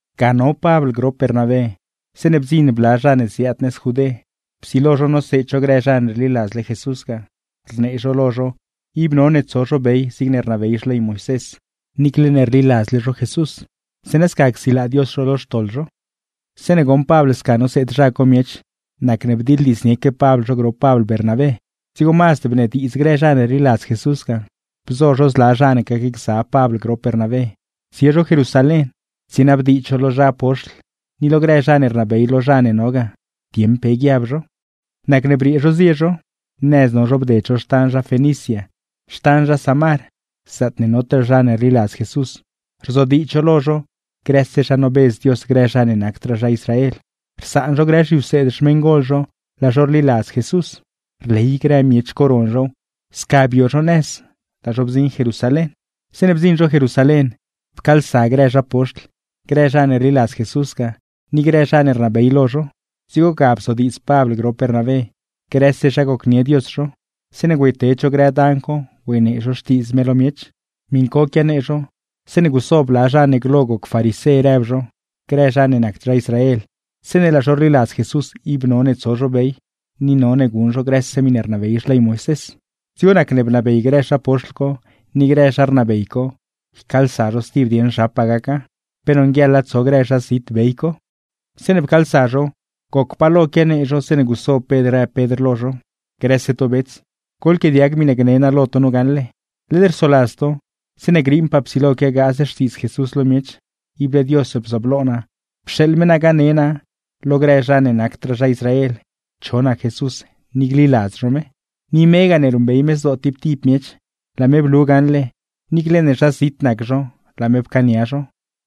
Ga no Pabl grop Bernabé zeeṉe bdziṉ bla zha ne ziaad nëz Judé, psilo zho noseed zho grë zha ne rliladzle Jesús ga, rnee zho lo zho ib none tso zho bey zigne rnabey xley Moisés, niicle ne rliladzle zho Jesús; zeeṉa sca csilaa Dios zho lo xtoḻ zho. Zeeṉe goṉ Pabl sca noseed zha co miech, nacne bdiḻdiidznieque Pabl zho grop Pabl Bernabé. Dzigo mazd bnediidz grë zha ne rliladz Jesús ga, bzo zho zla zha ne gacgza Pabl grop Bernabé tsie zho Jerusalén tsienabdiidz zho lo zha poxtl ni lo grë zha ne rnabey lo zha ne no ga, dieṉ pe guiab zho. Nacne briee zho zie zho. Nëz no zho bded zho xtan zha Fenicia, xtan zha Samar; zaatne notaa zha ne rliladz Jesús, rzodiidz zho lo zho grëse zha nobedz Dios grë zha ne nacdraa zha Israel, rsaan zho grë zhiwseed xmeṉgol zho laa zho rliladz Jesús. Rley grë miech co ron zhow. Sca bio zho nëz, laa zho bdziṉ Jerusalén. Zeeṉe bdziṉ zho Jerusalén, pcaalsa grë zha poxtl, grë zha ne rliladz Jesús ga, ni grë zha ne rnabey lo zho. Dzigo ga bzodiidz Pabl grop Bernabé grëse zha gocnie Dios zho, zeeṉe güeyted zho grë dan co güeynee zho Xtiidz me lo miech. Miṉ co quianee zho zeeṉe guso bla zha ne glo goc farisé rëb zho, grë zha ne nacd zha Israel zeeṉe laa zho rliladz Jesús ib none tso zho bey, ni none guṉ zho grëse miṉe rnabey Xley Moisés. Dzigo nacne bnabey grë zha poxtl co ni grë zha rnabey co, ycaalsa zho stib dieṉ zhapaa gaca, pe nonguieḻa tso grë zha zit bey co. Zeeṉe pcaalsa zho, goc pa lo quianee zho zeeṉe guso Pedr rëb Pedr lo zho: ―Grëse to bets, goḻquiaadiag miṉe gne naa lo to nu gaṉle. Led rsoladz to, zeeṉe griiṉpaa psilo quiagaaz Xtiidz Jesús lo miech, ible Dios bzooblo naa pxeeḻ me naa gaseed naa grë zha ne nacdraa zha Israel gliladz zho me. Ni megaa ne ruṉbey me zdoo tib tib miech, laa me blu gaṉle, niicle ne zha zit nac zho laa me pcaania zho;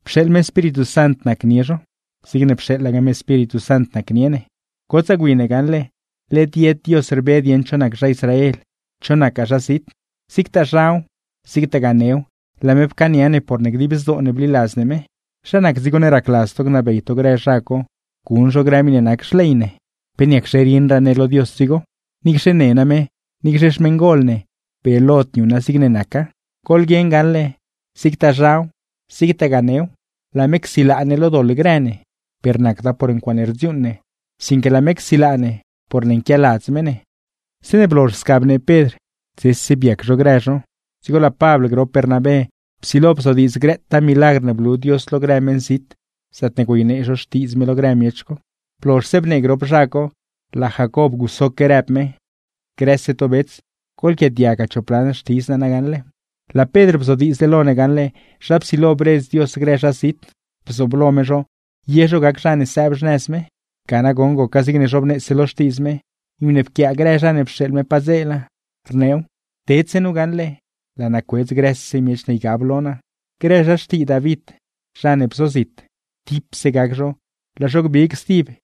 pxeeḻ me Espíritu Sant nacnie zho, zigne pxeeḻaque Espíritu Sant nacnie ne. Gotsaa gwi ne gaṉle, led yed Dios rbe dieṉ cho nac zha Israel cho nacgaa zha zit; zigtaa zhaw, zigtagaa new, laa me pcaania ne porne dib zdoo ne bliladz ne me. ¿Zha nac dzigo ne racladz to gnabey to grë zha co guṉ zho grë miṉe nac xley ne? ¿Pe niacxe rieṉraa ne lo Dios dzigo? ¡Niicxe ne name, niicxe xmeṉgol ne brieelod niuṉa zigne naca! Goḻguieṉ gaṉle, zigtaa zhaw zigtagaa new laa me csilaa ne lo doḻ grë ne, per nacda por ncuaaṉe rdziuuṉ ne; sinque laa me csilaa ne porne nquialadz me ne. Zeeṉe blozh sca bnee Pedr, dzese biac zho grë zho; dzigo laa Pabl grop Bernabé psilo bzodiidz grëtaa milagr ne blu Dios lo grë meṉzit zaatne güeynee zho Xtiidz me lo grë miech co. Blozhse bnee grop zha co, laa Jacob gusoque rëb me: ―Grëse to bets, goḻquiaadiaggaa chop lan xtidz naa nagaṉle gne naa lo to. Laa Pedr bzodiidzle lo ne gaṉle zha psilo bredz Dios grë zha zit, bzooblo me zho ye zho gac zha ne sëëb xnëz me. Ga nagoṉ goca zigne zhobneese lo Xtiidz me, miṉe pquiaa grë zha ne pxeeḻ me padzeela, rneew: Tedse nu gaṉle, laa naa cuedz grëse miech ne ygab lo naa; grë zha xtii David zha ne bzozit, laa zho gbig stib.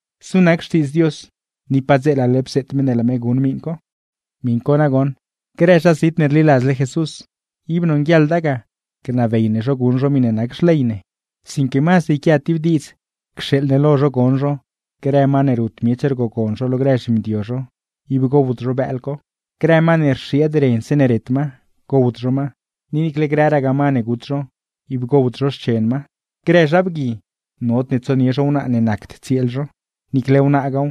Znu nac xtiidz Dios, ni padzeelale bzeet me ne laa me guṉ miṉ co. ’Miṉ co nagoṉ grë zha zit ne rliladzle Jesús, ib nonguieḻda ga gnabey ne zho guṉ zho miṉe nac xley ne. Sinque mazd yquia tib diidz cxeeḻ ne lo zho gon zho, grë ma ne rut miech rgogon zho lo grë zhimdio zho, ib gowd zho bëël co; grë ma ne rxieed ren zeeṉe ret ma, gowd zho ma; ni niicle grëragaa ma ne gut zho, ib gowd zho xchen ma. Grë zha bgui, nodne tsonie zho wnaa ne nacd tsieel zho; niicle wnaagaaw,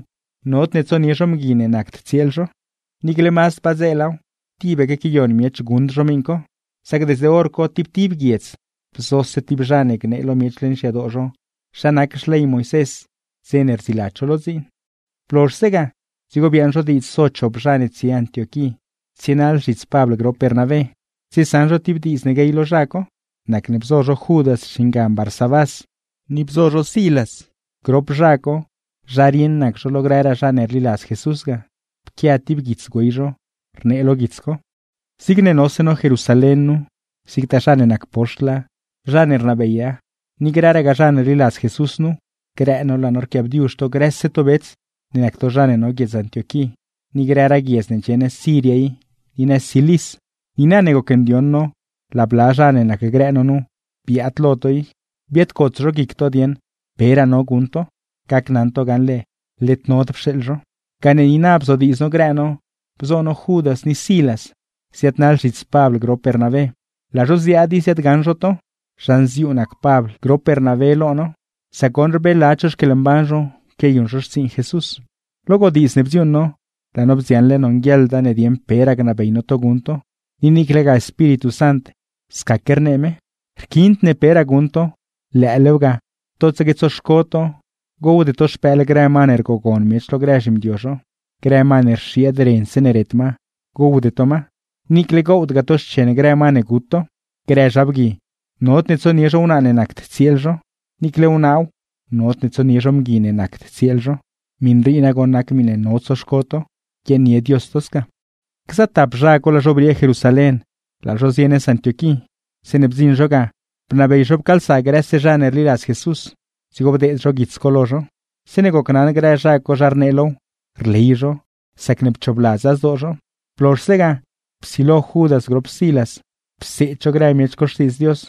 nodne tsonie zho mgui ne nacd tsieel zho. Niicle mazd padzeelaw, tibaque quiayon miech guṉd zho miṉ co; sac desde hor co tib tib guiedz bzose Moisés tib zha ne gneew lo miech leṉ xyadoo zho, dze ne rdziiladz zho lo dziin. Blozhse ga, dzigo biaaṉ zho diidz so chop zha ne tsie Antioquí tsienaḻ zhits Pabl grop Bernabé, tsiesaṉ zho ti diidz ne guey lo zha co. Nacne bzo zho Judas xingan Barsabás, ni bzo zho Silas; grop zha co, zha rieṉ nac zho lo grëraa zha ne rliladz Jesús ga. Pquia ti guits güey zho, rnee lo guits co: “Zigne nose no Jerusalén nu, zigtaa zha ne nac poxtla, zha ne rnabeya ni grëraa zha ne rliladz Jesús nuw, grë no laa no rquiaabdiuzh to grëse to bets ne nac to zha ne no guiedz Antioquí, ni grëraa guiedz ne ndxie nëz Siria i, ni nëz Cilis. ’Niina ne gocndioṉ no laa bla zha ne nacgrë no nu biaad lo to i, biaadcots zho guic to dieṉ peraa no guṉ to. Gacnaṉ to gaṉle led nod pxeeḻ zho, gane niina bzodiidz no grë no bzo no Judas ni Silas ziaadnaḻ zhits Pabl grop Bernabé, laa zho ziaad i ziaadgaṉ zho to. Zha nziuu nac Pabl grop Bernabé lo no, sac goṉ rbeeladz zho xquieḻmban zho quiayuṉ zho xtsiiṉ Jesús. ’Lo godiidz ne bdziuuṉ no, laa no bdziaṉle nonguieḻda ne dieṉ peraa gnabey no to guṉ to, ni niiclegaa Espíritu Sant scaque rnee me. Rquiind ne peraa guṉ to, lëëlew ga totsaque tsoxco to gowde to xpëël grë ma ne rgogon miech lo grë zhimdio zho; grë ma ne rxieed ren zeeṉe ret ma, gowde to ma; ni niicle gowdgaa to xchen grë ma ne gut to. Grë zha bgui, nodne tsonie zho wnaa ne nacd tsieel zho; niiclegaa wnaaw, nodne tsonie zho mgui ne nacd tsieel zho. Miṉ rii nagoṉ nac miṉe no tsoxco to. ’Guiaaṉnie Dios to sca.” Gza tap zha co laa zho briee Jerusalén, laa zho zie nëz Antioquí. Zeeṉe bdziṉ zho ga, bnabey zho pcaalsa grëse zha ne rliladz Jesús, dzigo bdeed zho guits co lo zho. Zeeṉe gocnaṉ grë zha co zha rnee low, rley zho sacne pchoobladza zdoo zho. Blozhse ga, psilo Judas grop Silas pseed zho grë miech co Xtiidz Dios,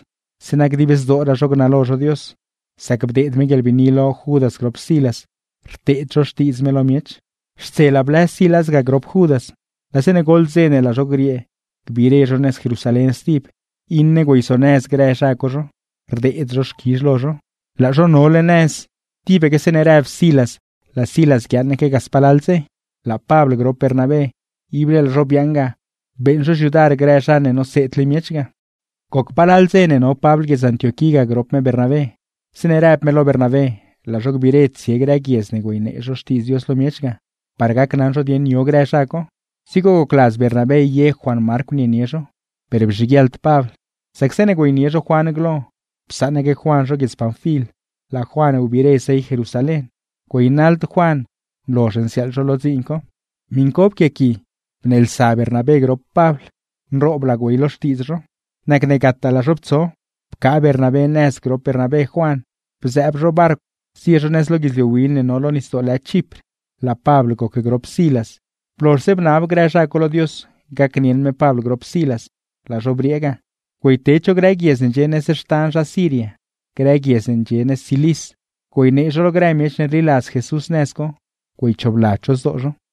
zeeṉa dib zdooraa zho gnalo zho Dios; sac bdeed me guieḻbiini lo Judas grop Silas rteed zho xtiidz me lo miech. Xtselaa blëz Silas ga grop Judas, laa zeeṉe goḻ dze ne laa zho griee gbiire zho nëz Jerusalén stib, iṉe güeyzonëz grë zha co zho, rdeed zho xquizh lo zho. [Laa zho nole nëz, tibaque zeeṉe rëb Silas laa Silas guiaaṉaque ga spalal dze.] Laa Pabl grop Bernabé ible laa zho biaaṉ ga beeṉ zho xyudar grë zha ne noseedle miech ga. Goc palal dze no Pabl guiedz Antioquí ga grop me Bernabé, zeeṉe rëb me lo Bernabé laa zho gbiire tsie grë guiedz ne güeynee zho Xtiidz Dios lo miech ga, par gacnaṉ zho dieṉ yo grë zha co. Dzigo gocladz Bernabé ye Juan Marcw nienie zho; per bzhiguieḻd Pabl, sac zeeṉe güeynie zho Juan glo, psaṉaque Juan zho guiedz Panfil, laa Juan biire zey Jerusalén, güeynaḻd Juan nlozh nsiaaḻ zho lo dziin co. Miṉ co pquiaqui bneelsa Bernabé grop Pabl, nrooblaa güey lo xtiidz zho; nacne gataa laa zho ptso. Pcaa Bernabé nëz grop Bernabé Juan bzëëb zho barcw zie zho nëz lo guidzliu win ne no lo nisdoo lë Chipr; laa Pabl goc grop Silas. Blozhse bnab grë zha co lo Dios gacnieṉ me Pabl grop Silas, laa zho briee ga güeyted zho grë guiedz ne ndxie nëz xtan zha Siria, grë guiedz ne ndxie nëz Cilis, güeynee zho lo grë miech ne rliladz Jesús nëz co, güeychoobladz zho zdoo zho.